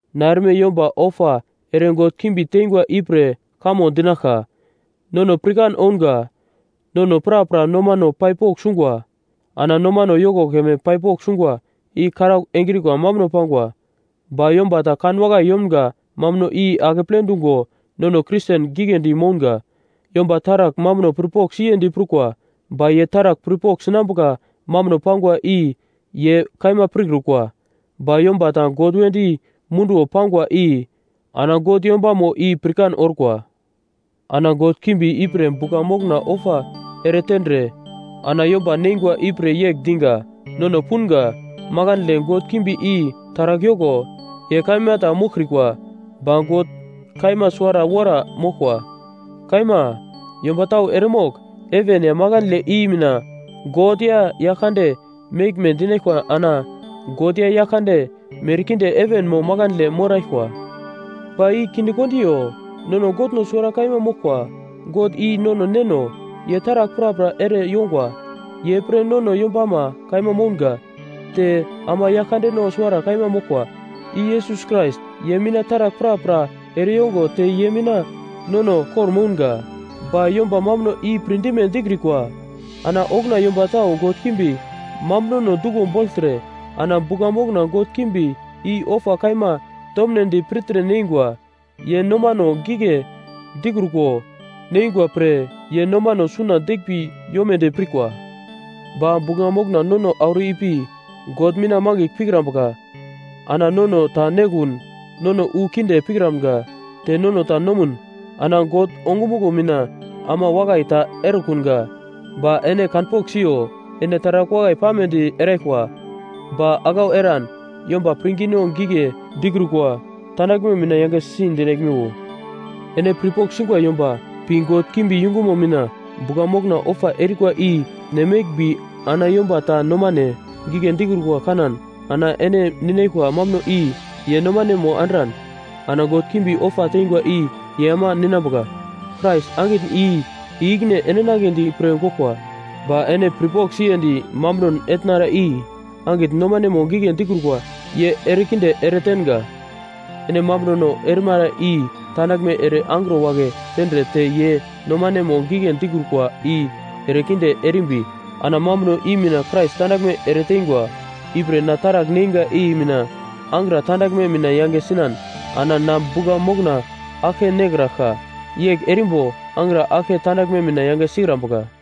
Ana erme yomba ofa ere god kimbi tengwa ipre kamo dinaglka: Nono pirkan ounga. Nono prapra nomano pai pogl sungwa. Ana nomano yoko keme pai pogl sungwa i karaugl engrikwa mambuno pangwa. Ba yomba ta kanwakai yomga mambuno i akeple dungo nono Kristen giglendi mounga. Yomba taragl mambuno pirpogl siyendi prukwa, ba ye taragl pirpogl sinambuka mambuno pangwa i ye kaima pirkrukwa. Ba yomba ta God wedi munduwo pangwa i ana God yombamo i pirkan orkwa. Ana god kimbi ipre bugla mokna ofa eretendre ana yomba neingwa ipre yegl diga: Nono punga, makandle god kimbi i taragl yoko, ye kaima ta moglkrikwa. Ba God kaima suwara wora moglkwa. Kaima, yomba tau eremogl heven ya makandle i mina “god” ya “yaglkande” meglme dinaglkwa ana “god” ya “yaglkande” merkinde heven mo makandle moraglkwa, ba i kinde kondiyo. Nono Godno suwara kaima moglkwa, God i nono Neno. Ye taragl prapra ere yongwa. Ye pre nono yombama kaima mounga. Te ama Yaglkandeno suwara kaima moglkwa, i Yesus Krais, ye mina taragl prapra ereyongo te ye mina nono kor-mounga. Ba yomba mambuno i pirdime dikrikwa. Ana okuna yomba tau god kimbi mambunono duglo bogltre ana bugla mokna god kimbi i ofa kaima tomnedi pirtre neingwa. Ye nomano gigle dikruko neingwa pre ye nomano suna deglmbi yomodi pirkwa. Ba bugla mokna nono auro ipi God mina mangigl pikrambuka. Ana nono ta nekun, nono wu kinde pikramga, te nono ta nomun, ana God ongumuglo mina ama wakai ta erekunga. Ba ene kanpogl siyo, ene taragl wakai pamedi eraglkwa, ba aglau eran yomba pirngino gigle dikrukwa tandaglme mina yangesi dinaglmiwo. Ene pirpogl singwa yomba pi god kimbi yungumo mina bugla mokna ofa erikwa i ne meglmbi ana yomba ta nomane gigle dikrukwa kanan, ana ene ninaglkwa mambuno i ye nomanemo andran, ana god kimbi ofa teingwa i ye ama ninambuka. Krais angitn i-ikine endinagledi pre goglkwa. Ba ene pirpogl siyendi mambunon etnara i angitn nomanemo gigle dikrukwa ye erekinde eretenga. Ene mambunono erimara i tandaglme ere angro wagle tendre te ye nomanemo gigle dikrukwa i erekinde erimbi, ana mambuno i mina Krais tandaglme eretengwa. Ipre, na taragl neinga i mina angra tandaglme mina yange sinan, ana na bugla mokna aglke nekraglka. Yegl erimbo angra aglke tandaglme mina yange sikrambuka.